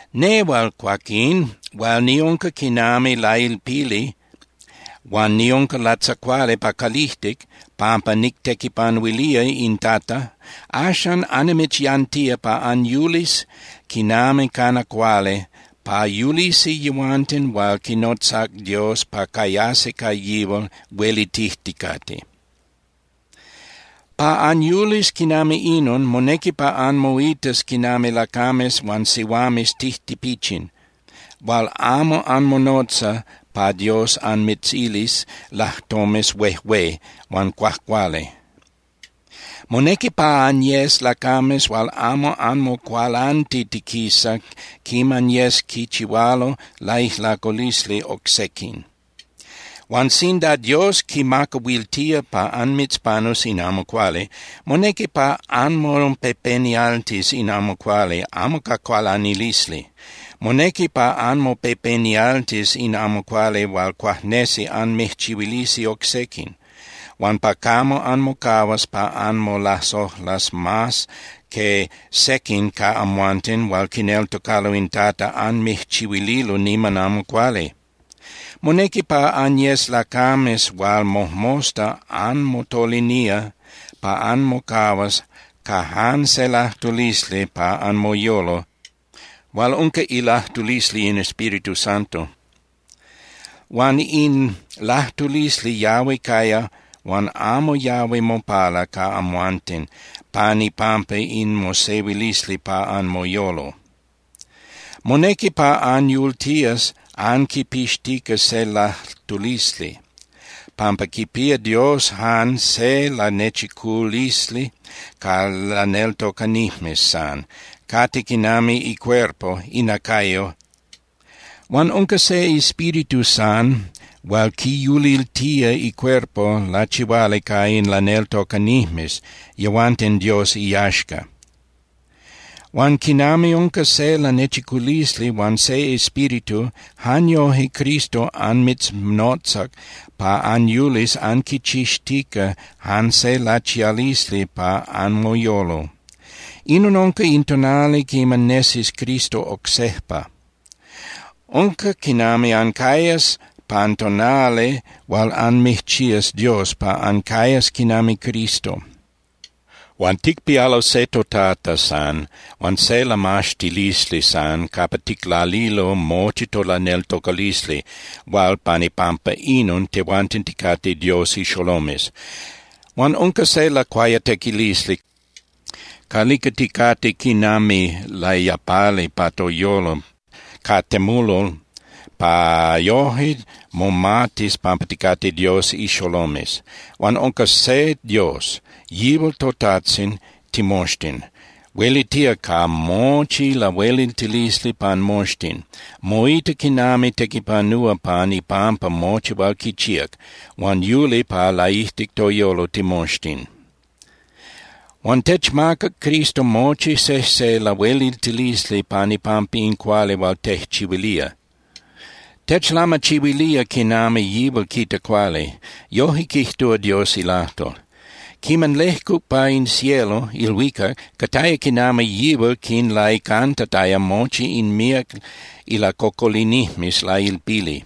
Nehual, cuaquín, hual niunca quinami lailpili huan niunca latzacuali pa calijtic pampa nictequipanuilía in Tata, axan annimitzyantía pa anyulis quinami cana cuali pa yulisi yehuanten hual quinnotzac Dios pa cayasi ca yihual huelitijticate. Pa anyulis quinami inon, monequi pa anmoitas quinami lacames huan sihuames tijtipichin hual amo anmonotza pa Dios anmitzilis lajtomes huejué huan cuajcuali. Monequi pa anyes lacames hual amo anmocualantitiquisa quiman yes quichihualo laijlaculisli oc sequin. Huan sinda Dios quimacahuiltía pa anmitzpanus in amo cuali, monequi pa anmopepenialtis in amo cuali amo ca cualanilisli. Monequi pa anmopepenialtis in amo cuali hual cuajnesi anmijchihuilisi oc sequin, huan pa camo anmocahuas pa anmolasojlas mas que sequin ca amhuanten hual quineltocalo in Tata anmijchihuililo niman amo cuali. Monequi pa anyes lacames hual mojmosta anmotolinía pa anmocahuas ca jan se lajtulisli pa anmoyolo hual unca ilajtulisli in Espíritu Santo. Huan in lajtulisli yahui caya huan amo yahui mopala ca amhuanten pan ipampa in mosehuilisli pa anmoyolo. Monequi pa anyultías anquipixtica se lajtulisli, pampa quipía Dios jan se lanechiculisli ca laneltocanijmes san. Cate quinami icuerpo (inacayo). Huan unca se Espíritu san hual quiyuliltía icuerpo lachihuali ca in laneltocanijmes, yehuanten Dios iyaxca. Huan quinami unca se lanechiculisli huan se Espíritu, jan yoje Cristo anmitznotzac pa anyulis anquichixtica jan se lachialisli pa anmoyolo. Inon unca in tonali quiman nesis Cristo oc sejpa. Unca quinami ancayas pan tonali hual anmijchías Dios pa ancayas quinami Cristo. Huan ticpialo se toTata san huan se lamaxtilisli san capa ticlalilo mochi tolaneltocalisli hual pan ipampa inon tehuanten ticate Dios ixolomes. Huan unca se lacuayatequilisli calica ticate quinami layapali pa toyolo ca temulol pa yoje momatis pampa ticate Dios ixolomes. Huan unca se Dios, yihual toTajtzin timoxtin. Huelitía ca mochi lahueliltilisli pan moxtin, moita quinami tequipanúa pan ipampa mochi hual quichíac, huan yuli pa laijtic toyolo timoxtin. Huan techmacac Cristo mochi sejse lahueliltilisli pan ipampa in cuali hual tejchihuilía. Techlamachihuilía quinami yihual quita cuali. Yoje quijtúa Dios ilajtol: Quiman lejcuc pa in cielo (ilhuicac), cataya quinami yihual quinlaicantataya mochi in míac ilacocolinijmes lailpili.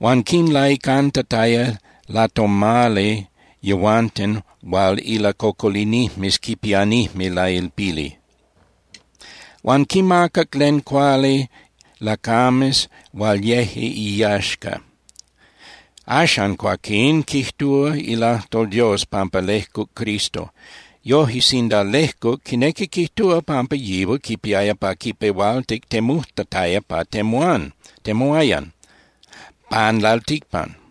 Huan quinlaicantataya latomali yehuanten hual ilacocolinijmes quipianijme lailpili, huan quinmacac len cuali lacames hual yeje iyaxca. Axan, cuaquín, quijtúa ilajtol Dios pampa lejcuc Cristo. Yoje, sinda “lejcuc”, quinequi quijtúa pampa yihual quipiaya pa quipehualtic temujtataya pa temuán (temuayan) pan lalticpan.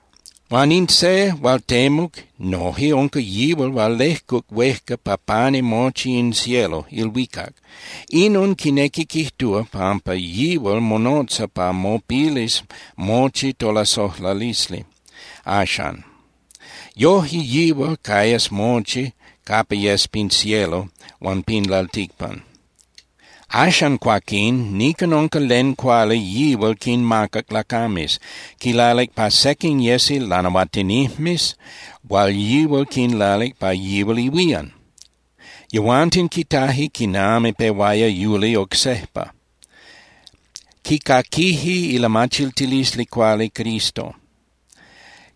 Huan in se hual temuc noje unca yihual hual lejcuc huejca pa pani mochi in cielo (ilhuicac). Inon quinequi quijtúa pampa yihual monotza pa mopilis mochi tolasojlalisli axan. Yoje yihual cayas mochi capa yes pin cielo huan pin lalticpan. Axan, cuaquín, nican unca len cuali yihual quinmacac lacames. Quilalic pa sequin yesi lanahuatinijmes hual yihual quinlalic pa yihual ihuían. Yehuanten quitaje quiman pehuaya yuli oc sejpa. Quicaquije ilamachiltilisli cuali Cristo.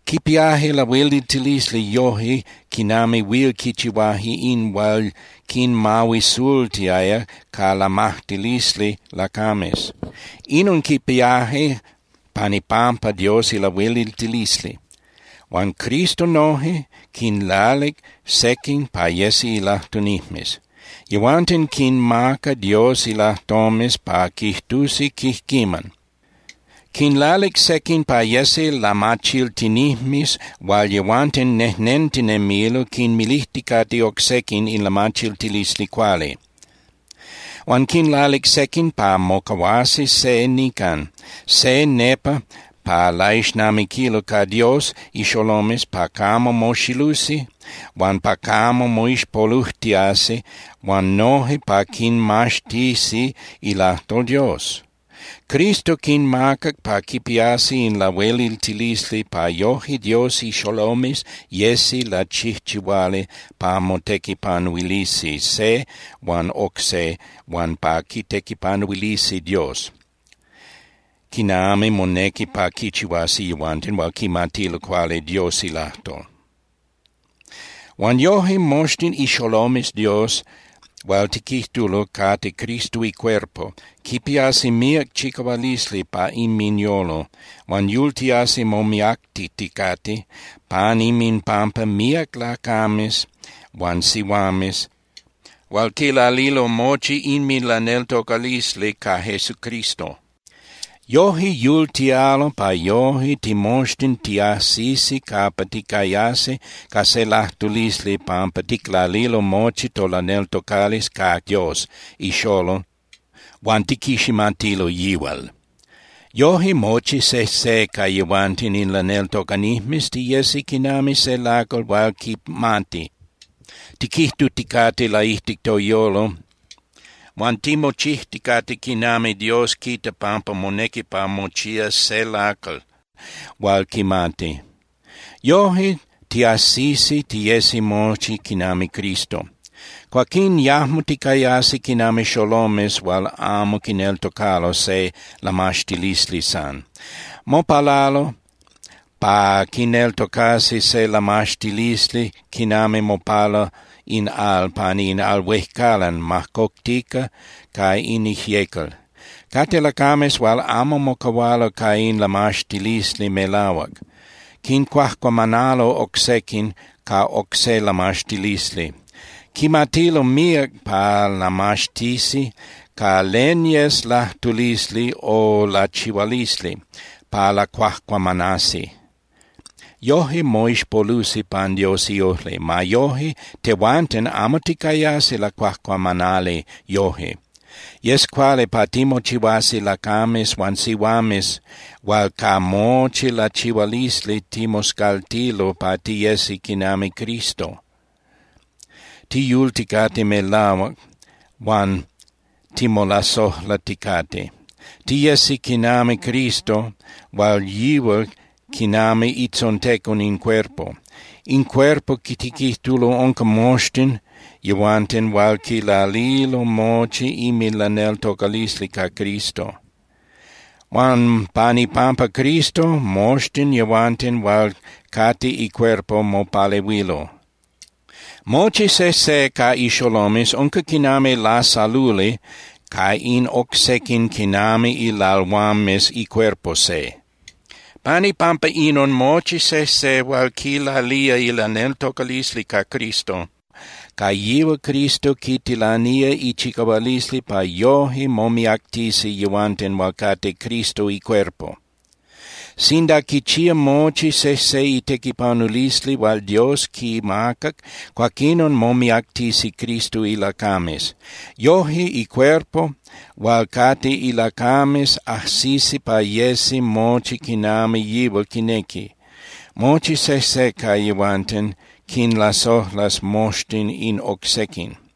Quipiaje lahueliltilisli yoje quinami huil quichihuaje in hual quinmahuisultiaya ca lamajtilisli lacames. Inon quipiaje pan ipampa Dios ilahueliltilisli. Huan Cristo noje quinlalic sequin pa yesi ilajtunijmes. Yehuanten quinmaca Dios ilajtomes pa quijtusi quijquiman. Quinlalic sequin pa yesi lamachiltinijmes hual yehuanten nejnentinemilo quinmilijticate oc sequin in lamachiltilisli cuali. Huan quinlalic sequin pa mocahuasi se nican, se nepa pa laixnamiquilo ca Dios ixolomes pa camo moxilusi huan pa camo moixpolujtiasi huan noje pa quinmaxtisi ilajtol Dios. Cristo quinmacac pa quipiasi in lahueliltilisli pa yoje Dios ixolomes yesi lachijchihuali pa motequipanuilisi se huan oc se huan pa quitequipanuilisi Dios, quinami monequi pa quichihuasi yehuanten hual quimatilo cuali Dios ilajtol. Huan yoje moxtin ixolomes Dios hual tiquijtulo cate Cristo icuerpo quipiasi míac chicahualisli pa inminyolo huan yultiasi momiactiticate pan inminpampa míac lacames huan sihuames hual quilalilo mochi inminlaneltocalisli ca Jesucristo. Yoje yultialo pa yoje timoxtin tiajsisi capa ticayasi ca se lajtulisli pampa ticlalilo mochi tolaneltocalisli ca Dios ixolol huan tiquiximatilo yihual. Yoje mochi sejse ca tehuanten in laneltocanijmes tiyesi quinami se lacal hual quimati, tiquijtuticate laijtic toyolo huan timochijticate quinami Dios quita pampa monequi pa mochías se lacal hual quimati. Yoje tiajsisi tiyesi mochi quinami Cristo. Cuaquín yajmo ticayasi quinami xolomes hual amo quineltocalo se lamaxtilisli san. Mopalalo pa quineltocasi se lamaxtilisli quinami mopala in al pani in al huejcalan majcoctica ca in ijyecal. Cate lacames hual amo mocahualo ca in lamaxtilisli melahuac. Quincuajcuamanalo oc sequin ca oc se lamaxtilisli. Quimatilo míac pa lamaxtisi ca len yes lajtulisli o lachihualisli pa lacuajcuamanasi. Yoje moixpolusi pan Dios iojli. Ma yoje, tehuanten amo ticayasi lacuajcuamanali yoje. Yes cuali pa timochihuasi lacames huan sihuames hual ca mochi lachihualisli timoscaltilo pa tiyesi quinami Cristo, tiyulticate melahuac huan timolasojlaticate. Tiyesi quinami Cristo hual yihual quinami itzontecon in cuerpo. In cuerpo tiquijtulo unca moxtin yehuanten hual quilalilo mochi inminlaneltocalisli ca Cristo. Huan pan ipampa Cristo, moxtin yehuanten hual cate icuerpo mopalehuilo. Mochi sejse ca ixolomes unca quinami lasaluli ca in oc sequin quinami ilalhuames icuerpo se. Pan ipampa inon, mochi sejse hual quilalía ilaneltocalisli ca Cristo, ca yihual Cristo quitilanía ichicahualisli pa yoje momiactisi yehuanten hual cate Cristo icuerpo. Sinda quichía mochi sejse itequipanulisli hual Dios quimacac, cuaquinon momiactisi Cristo ilacames. Yoje icuerpo hual cate ilacames ajsisi pa yesi mochi quinami yihual quinequi. Mochi sejse ca yehuanten quinlasojlas moxtin in oc sequin.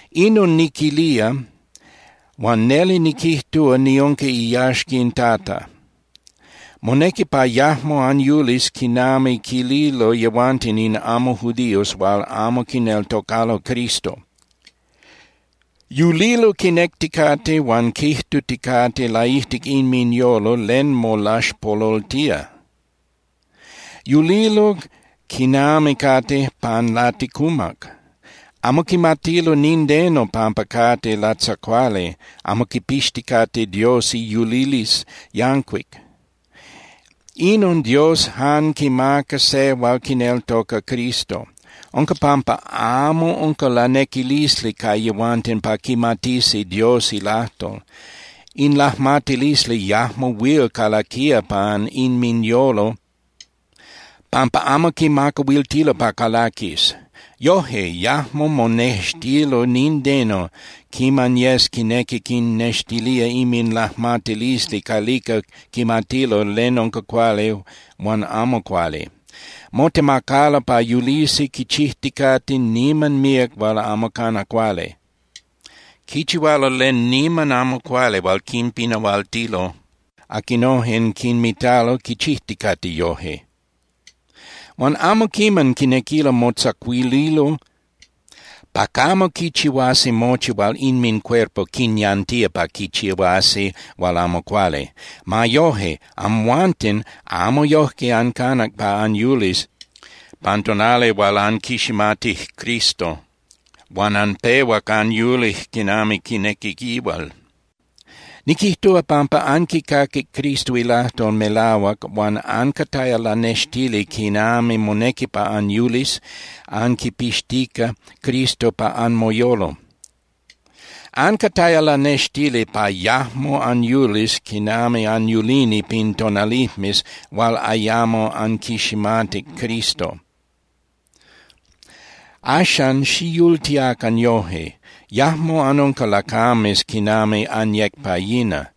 Inon niquilía, huan neli niquijtúa niunca iyaxca in Tata. Monequi pa yajmo anyulis quinami quililo yehuanten in amo judíos hual amo quineltocalo Cristo. Yulilo quinecticate huan quijtuticate laijtic inminyolo len molaxpololtía. Yulilo quinami cate pan laticumac. Amo quimatilo nindeno pampa cate latzacuali amo quipixticate Dios iyulilisli yancuic. Inon Dios jan quimaca se hual quineltoca Jesucristo. Unca pampa amo unca lanequilisli ca yehuanten pa quimatisi Dios ilajtol. In lajmatilisli yajmo huil calaquía pan inminyolo pampa amo quimacahuiltilo pa calaquis. Yoje yajmo monextilo nindeno quiman yes quinequi quinnextilía inminlajmatilisli calica quimatilo len unca cuali huan amo cuali. Motemacalo pa yulisi quichijticate niman míac hual amo cana cuali. Quichihualo len niman amo cuali hual quinpinahualtilo aquinojen quinmitalo quichijticate yoje. Huan amo quiman quinequilo motzacuililo pa camo quichihuasi mochi hual inmincuerpo quinyantía pa quichihuasi hual amo cuali. Ma yoje, amhuanten amo yojque ancanac pa anyulis pan tonali hual anquiximatic Cristo huan anpehuac anyulic quinami quinequi yihual. Niquijtúa pampa anquicaquic Cristo ilajtol melahuac huan ancataya lanextili quinami monequi pa anyulis anquipixtica Cristo pa anmoyolo. Ancataya lanextili pa yajmo anyulis quinami anyulini pin tonalijmes hual ayamo anquiximatic Cristo. Axan, xiyultiacan yoje. Yajmo anunca lacames quinami anyec pa yina.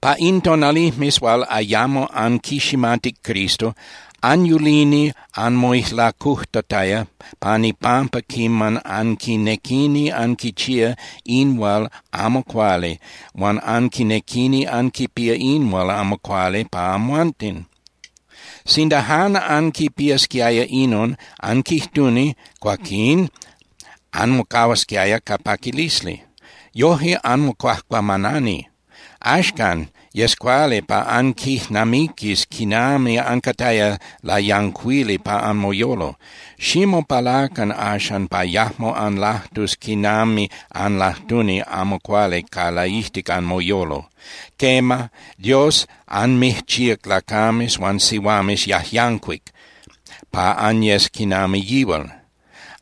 Pa in tonalijmes hual ayamo anquiximatic Cristo, anyulini anmoijlacujtataya pan ipampa quiman anquinequini anquichía in hual amo cuali huan anquinequini anquipía in hual amo cuali pa amhuanten. Sinda jan anquipiasquiaya inon, anquijtuni, cuaquín anmocahuasquiaya ca paquilisli. Yoje anmocuajcuamanani. Axcan, yes cuali pa anquijnamiquis quinami ancataya layancuili pa anmoyolo. Ximopalacan axan pa yajmo anlajtus quinami anlajtuni amo cuali ca laijtic anmoyolo. Quema, Dios anmijchíac lacames huan sihuames yajyancuic pa anyes quinami yihual.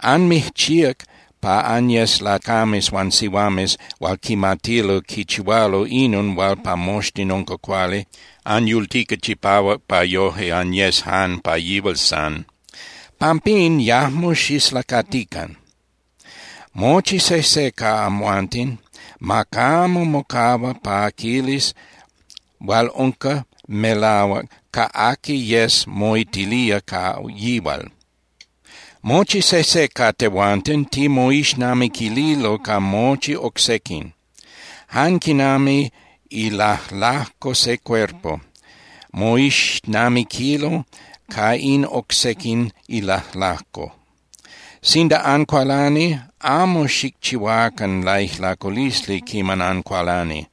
Anmijchíac pa anyes lacames huan sihuames hual quimatilo quichihualo inon hual pa moxtin unca cuali, anyultica chipahuac pa yoje anyes jan pa yihual san. Pampín, yajmo xislacatican. Mochi sejse capa amhuanten ma camo mocahua pa quilis hual unca melahuac ca aqui yes moitilía ca yihual. Mochi sejse ca tehuanten timoixnamiquililo ca mochi oc sequin, jan quinami ilajlajco se icuerpo moixnamiquilo ca in oc sequin ilajlajco. Sinda ancualani, amo xicchihuacan laijlaculisli quiman ancualani.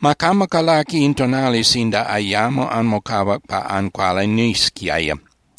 Ma camo calaqui in tonali sinda ayamo anmocahuac pa ancualanisquiaya.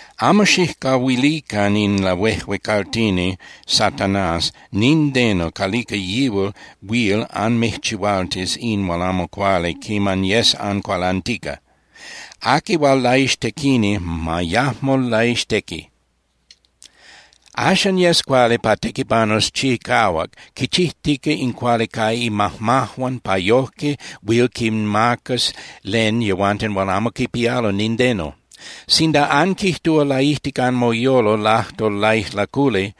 Amo xijcahuilican in lahuejuecaltini Satanás nindeno calica yihual huil anmijchihualtis in hual amo cuali quiman yes ancualantica. Aqui hual laixtequini, ma yajmo laixtequi. Axan, yes cuali pa tequipanus chicahuac quichijtica in cuali ca imajmajuan pa yojque huil quinmacas len yehuanten hual amo quipialo nindeno. Sinda anquijtúa laijtic anmoyolo lajtol laijlaculi,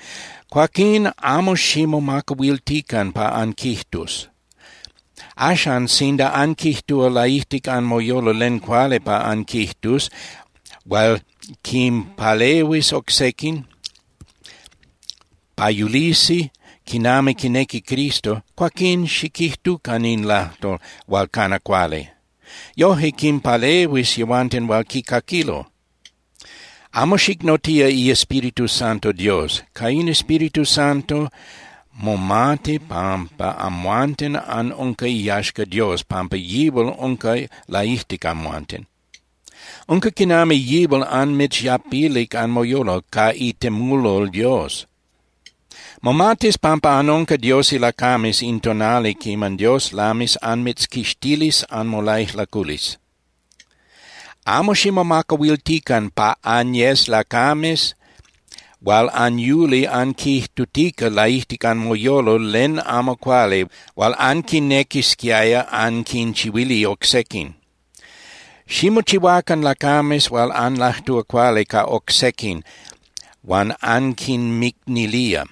cuaquín amo ximomacahuiltican pa anquijtus. Axan, sinda anquijtúa laijtic anmoyolo len cuali pa anquijtus hual quinpalehuis oc sequin pa yulisi quinami quinequi Cristo, cuaquín xiquijtucan in lajtol hual cana cuali. Yoje quinpalehuis yehuanten hual quicaquilo. Amo xicnotía iEspíritu Santo Dios. Ca in Espíritu Santo momati pampa amhuanten anunca iyaxca Dios pampa yihual unca laijtic amhuanten. Unca quinami yihual anmitzyapilic anmoyolo ca itemulol Dios. Momatis pampa anunca Dios ilacames in tonali quiman Dios lamis anmitzquixtilis anmolaijlaculisli. Amo ximomacahuiltican pa anyes lacames hual anyuli anquijtutica laijtic anmoyolo len amo cuali hual anquinequisquiaya anquinchihuili oc sequin. Ximochihuacan lacames hual anlajtúa cuali ca oc sequin huan anquinmicnilía.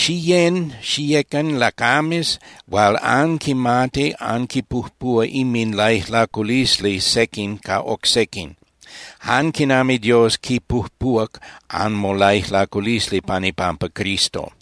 Xiyén (Xiyecan) lacames hual anquimati anquipujpúa inminlaijlaculisli sequin ca oc sequin jan quinami Dios quipujpúac anmolaijlaculisli pan ipampa Cristo.